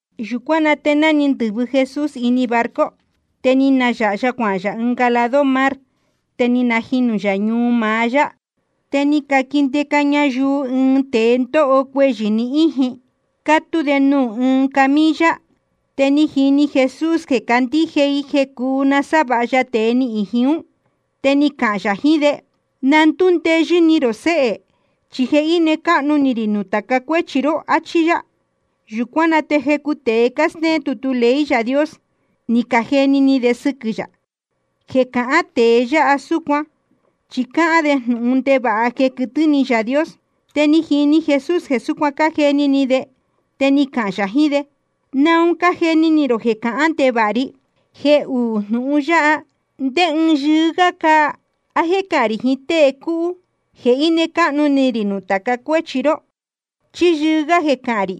Yūcuán na te ni ndɨ̄vɨ Jesús ini barco. Te ni nayāha ya cuahān yā ɨnga lado mar, te ni najinū yā ñuu maá yá. Te ni caquindeca ñayuu ɨɨn tēe ndóho cuehyɨ̄ ni íjin, cátú de nuū ɨɨn camilla. Te ni jini Jesús jeē cácandíje i jeē cúu nasávāha ya tēe ní íjin ún. Te ni cahān yā jiín de: Na ndúndeyɨ́ ni rō séhē, chi je íne cáhnu ni rī nuū tāca cuéchi ró, áchí yá. Yūcuán na te jecu tēe cástéén tutu ley Yaā Dios, ni cajeni ni de sɨquɨ̄ yā: Jeē cahán tēe yáha súcuan, chi cáhán de jnūhun ndevāha jeē quɨtɨ́ ni Yaā Dios. Te ni jini Jesús jeē súcuan cájeni ni de, te ni cahān yā jiín de: ¿Naun cájeni ni rō jeē cahán ndevāha ri? Jeē uú jnūhun yáha, ¿ndé ɨɨn yɨɨ́ gá cáa? ¿A jéē cahán rī jiín tée cúhú: Je íne cáhnu ni rī nuū tāca cuéchi ró? ¿Chí yɨɨ́ gá jeē cahān rī: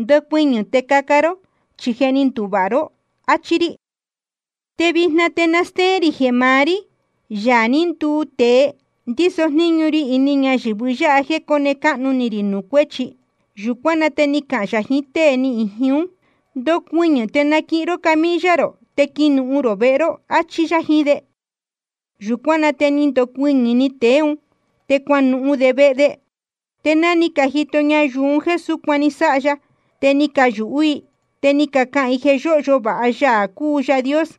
Ndocuɨñɨ̄ te caca ró, chi je ni nduvāha ró, achi rī? Te vijna te na stéén rī jeē maá rí, Yaā ní nduu tēe, ndíso jníñu ri ini ñayɨ̄vɨ yáha jéē cóne cáhnu ni rī nuū cuéchi. Yūcuán na te ni cahān yā jiín tée ni íjin ún: Ndocuɨñɨ̄ te naquihin ró camilla rō te quinuhun rō vehe ró, áchí yá jiín de. Yūcuán na te ni ndocuɨñɨ̄‑ni tēe ún, te cuanuhun de vehe de. Te ná ni cajito ñayuu un jéē súcuan ni sáha ya, te ni cayūhú i. Te ni cacahān i jeē yóhyo vāha Yaā cúu Yaā Dios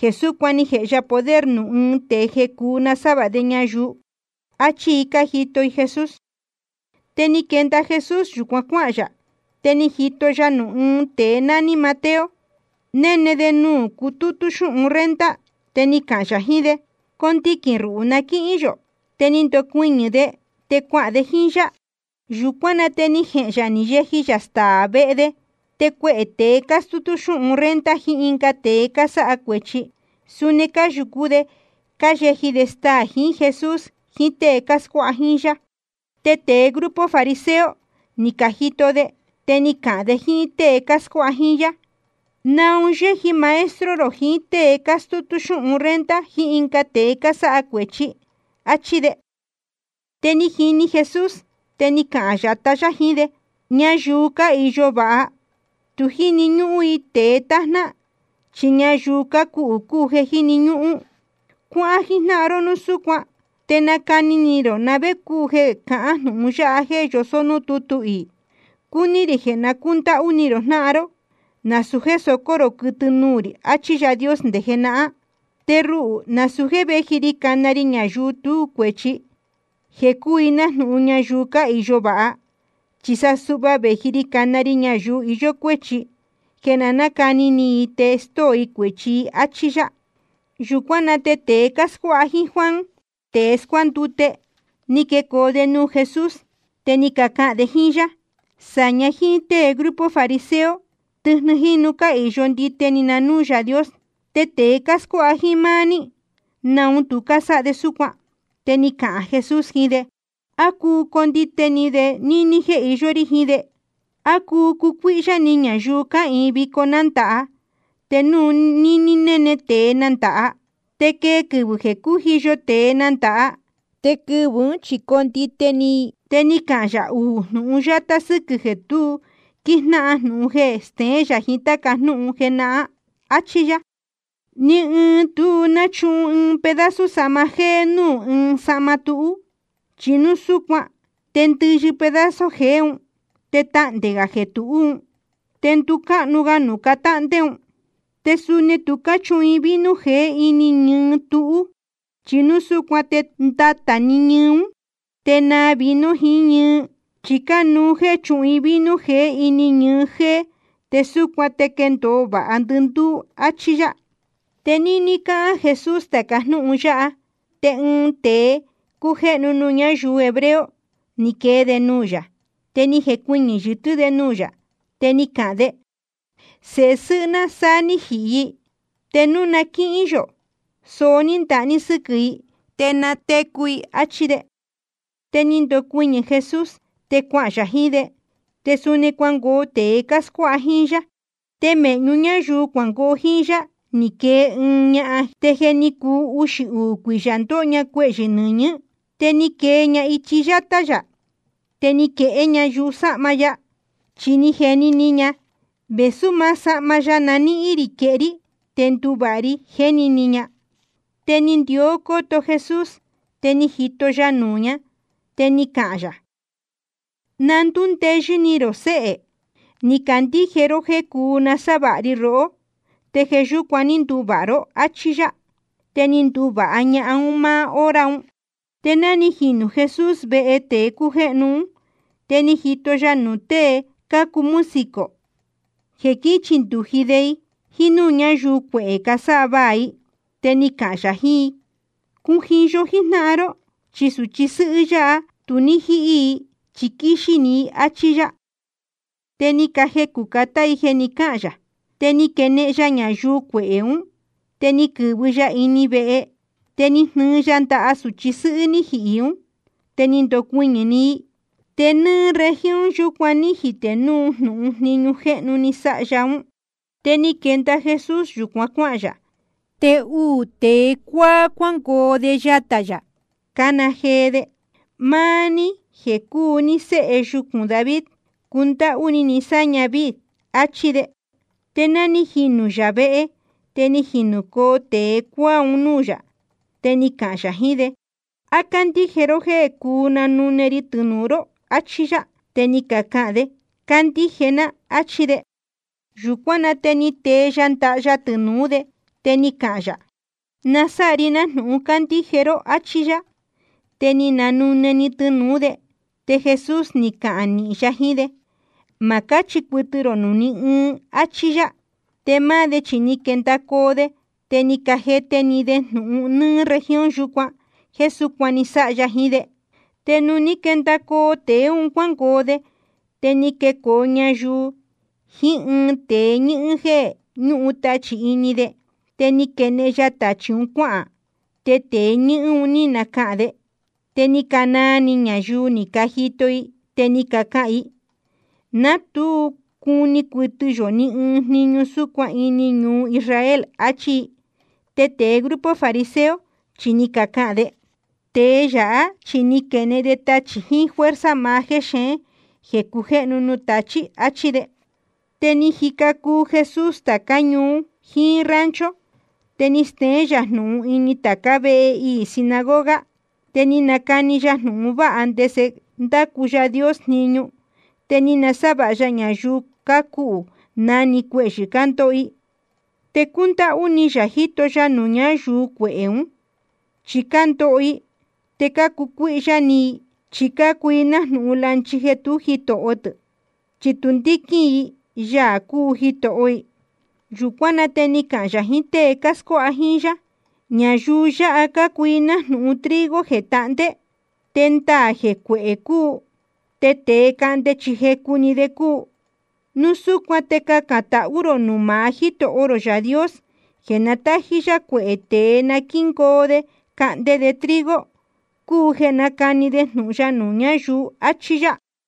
jeē súcuan ni jēhe ya poder nuū ɨɨn tēe jeē cúu nasávāha de ñayuu, achí i cájito i Jesús. Te ni quenda Jesús yūcuan cuáhān yā. Te ni jito ya nuū ɨɨn tēe nání Mateo, néne de nuū cutútú xúhun renta. Te ni cahān yā jiín de: Condiquīn ruhū na quíhín yō. Te ni ndocuɨñɨ̄ de, te cuahān de jíín yá. Yūcuán na te ni jehēn yā ni yeji yā staā vehe de. Te cuehē tēe cástútú xúhun renta jiín ɨnga tēe cásáha cuēchi, suni cáyūcú de cáyeji de staā jiín Jesús jiín tée cáscuáha jíín yá. Te tēe grupo fariseo, ni cajito de, te ni cacahān de jíín tée cáscuáha jíín yá: ¿Naun yéji maestro rō jiín tée cástútú xúhun renta jiín ɨnga tēe cásáha cuēchi? áchí de. Te ni jini Jesús, te ni cahān yatá yá jiín de: Ñayuu cáhīyo vāha, tu jíni ñúhún i tēe tájná, chi ñayuu cácuhū cúu jeē jíni ñúhún. Cuáhán jíjnáhan ró núu súcuan, te nacani ni rō na vé cúu jeē cahán jnūhun yáha jéē yosó núū tútu iī: Cúní rī jeē na cúndáhú ni rō jnáhan ró, nasūu jéē socó rō quɨtɨ nuū rī, achí Yaā Dios nde jenahán. Te ruhū nasūu jéē véji ri cana ri ñayuu tú cuēchi, jeē cúu i nájnūhun ñayuu cáhīyo vāha, chi sa suhva vēji ri cana ri ñayuu iyó cuéchi, jeē na nácani ni i te stóo i cuēchi i. Achí yá. Yūcuán na te tēe cáscuáha jíín Juan tēe scuándute, ni quecoo de nuū Jesús. Te ni cacahān de jíín yá: Sāña jíín tée grupo fariseo, tɨjnɨ jínu cáhīyo ndite ni na núū Yaā Dios. Te tēe cáscuáha jíín máá ní, ¿naun tu cásáha de súcuan? Te ni cahān Jesús jiín de: ¿A cuu condite ni de níní jéē iyó rí jiín de? ¿A cuu cucuíhyá ni ñayuu cáhīin vico nándāha, te núu níní néne tēe nándāha? Te quee quɨvɨ̄ jeē cújiyo tēe nándāha, te quɨvɨ̄ ún chi condite ni i. Te ni cahān yā uū jnūhun yátá sɨ́quɨ̄ jeē tu quíjnáhan jnūhun jeé jéē steén yā jiín táca jnúhun jenahán. Achí yá: Ni ɨɨn tu náchuhun ɨɨn pedazo sahma jéé núū ɨɨn sahma túhú. Chi núu súcuan te ndɨyɨ pedazo jeé un, te tahndē gā jeē tuhú un, te nducáhnu ga nuū catáhndé un. Te suni tu cáchuhun vino jeé ini ñɨɨ túhú. Chi núu súcuan te ndatā ñɨɨ ún, te naa vino jiín ñɨɨ. Chi cánuú jéē chúhun i vino jeé ini ñɨɨ jéé, te súcuan te quéndōo vāha ndɨndúú. Achí yá. Te níní cáhán Jesús tāca jnúhun yáha, te ɨɨn tēe cújéhnu nuū ñáyuu hebreo, ni quee de nuū yā. Te ni jecuɨñɨ̄ yɨtɨ́ de nuū yā, te ni cahān de: Sēhe sɨ́hɨ́ ná sá ní jihī i. Te núu na quíhín yō soó ní ndaha ní sɨ́quɨ̄ i, te natecu i. Achí de. Te ni ndocuɨñɨ̄ Jesús, te cuahān yā jiín de, te suni cuangoo tēe cáscuáha jíín yá. Te mēhñu ñáyuu cuangoo jíín yá ni quee ɨɨn ñahan, te je ni cuu uxī uū cuiyā ndóho ña cuehyɨ̄ nɨñɨ̄. Te ni quee ña ichi yátá yā, te ni quehé ña yusáhma ya. Chi ni jeni ni ña: Vēsú maá sahma ya na níhín rī quehé rí, te nduvāha ri, jéni ni ña. Te ni ndió cóto Jesús, te ni jito ya nuū ña, te ni cahān yā: Na ndúndeyɨ́ ni rō, séhē. Ni candíje ró jéē cuu nasávāha ri rohó, te jeē yúcuan ní nduvāha ró, áchí yá. Te ni nduvāha ña máá hora un. Te ná ni jinū Jesús vehe tēe cújéhnu ún, te ni jito ya nuū tée cácuu músico jeē quíchindūji de i, jíín núū ñáyuu cuehē, cásávaā i. Te ni cahān yā jiín i: Cujiyo jíjnáhan ró, chi sūchi sɨ́hɨ́ yáha, tu ní jíhí i chi quíxí‑ni i, áchí yá. Te ni cajecū catá i jeē ni cáhān yā. Te ni quenehen ya ñayuu cuehē ún, te ni quɨ̄vɨ ya ini vehe. Te ni jnɨɨ ya ndaha sūchi sɨ́hɨ́ ní jihī ún, te ni ndocuɨñɨ̄‑ni i. Te nɨ́ɨ́ región yūcuan ní jitē núu jnūhun jniñu jéhnu ní sáha ya ún. Te ni quenda Jesús yūcuan cuáhān yā. Te uū tēe cuáá cuángoo de yatā yā, cácana jee de: Máá ní jeē cúu ní Sēhe yucūn David, cundáhú ni ni sáña víī, achí de. Te ná ni jinū yā vehe, te ni jinūcoo tēe cuáá un núū yā. Te ni cahān yā jiín de: ¿A cácandíje ró jéē cúu nanune ri tɨnūu ró? achí yá. Te ni cacahān de: Cácandíje ná, áchí de. Yūcuán na te ni tee ya ndaha ya tɨnūú de, te ni cahān yā: Na sáha ri nájnūhun cácandíje ró, áchí yá. Te ni cananune‑ni tɨnūú de. Te Jesús ni cahān nīhin ya jiín de: Ma cáchi cuɨtɨ rō nuū ni ɨɨn, áchí yá. Te máá de chi ni quendacoo de, te ni cajete‑ni de jnūhun nɨ́ɨ́ región yūcuan jéē súcuan ni sáha ya jiín de. Te nuū ní quendacoo tēe un cuángoo de, te ni quecoo ñayuu jiín ɨɨn tēe ñɨ́hɨ́n, jeē ñúhun tachī ini de. Te ni quenehen ya tachī un cuáhān. Te tēe ñɨ́hɨ́n un ní nacahān de. Te ni canaa ni ñayuu ni cajito i, te ni cacahān i: Ná tu cuni cuɨtɨ yō ni ɨɨn jniñu súcuan ini ñuu Israel, achí i. Te tēe grupo fariseo chi ni cacahān de: Tēe yáha chi quénehen de tachī jiín fuerza maá jexeén jeē cujéhnu nuū tachī, achí de. Te ni jica cuu Jesús tācá ñuu jiín rancho, te ni steén yā jnūhun ini tācá vehe iī sinagoga. Te ni nacani ya jnūhun vāha ndese ndácu Yaā Dios jniñu. Te ni nasávāha ya ñayuu cácuhū na‑ni cuehyɨ̄ cándoho i. Te cúndáhú ni yā jíto ya nuū ñáyuu cuehē ún. Chi cándoho i te cácucuíhyá ni i, chi cácuu i nájnūhun lanchi jeē tú jitoho tɨ̄, chi tu ndíquín i Yaā cúu Jitoho i. Yūcuán na te ni cahān yā jiín tée cáscuáha jíín yá: Ñayuu yáha cácuu i nájnūhun trigo jeē tahndé, te ndaā jeē cuehē cúu, te tēe cahnde chi jecu‑ni de cúu. Núu súcuan te cacān tahú rō nuū maá Jítoho rō Yaā Dios jeē na tájí yá cuehē tēe na quíngoo de cahnde de trigo, cúu jeē nácani de jnūhun ya nuū ñáyuu. Achí yá.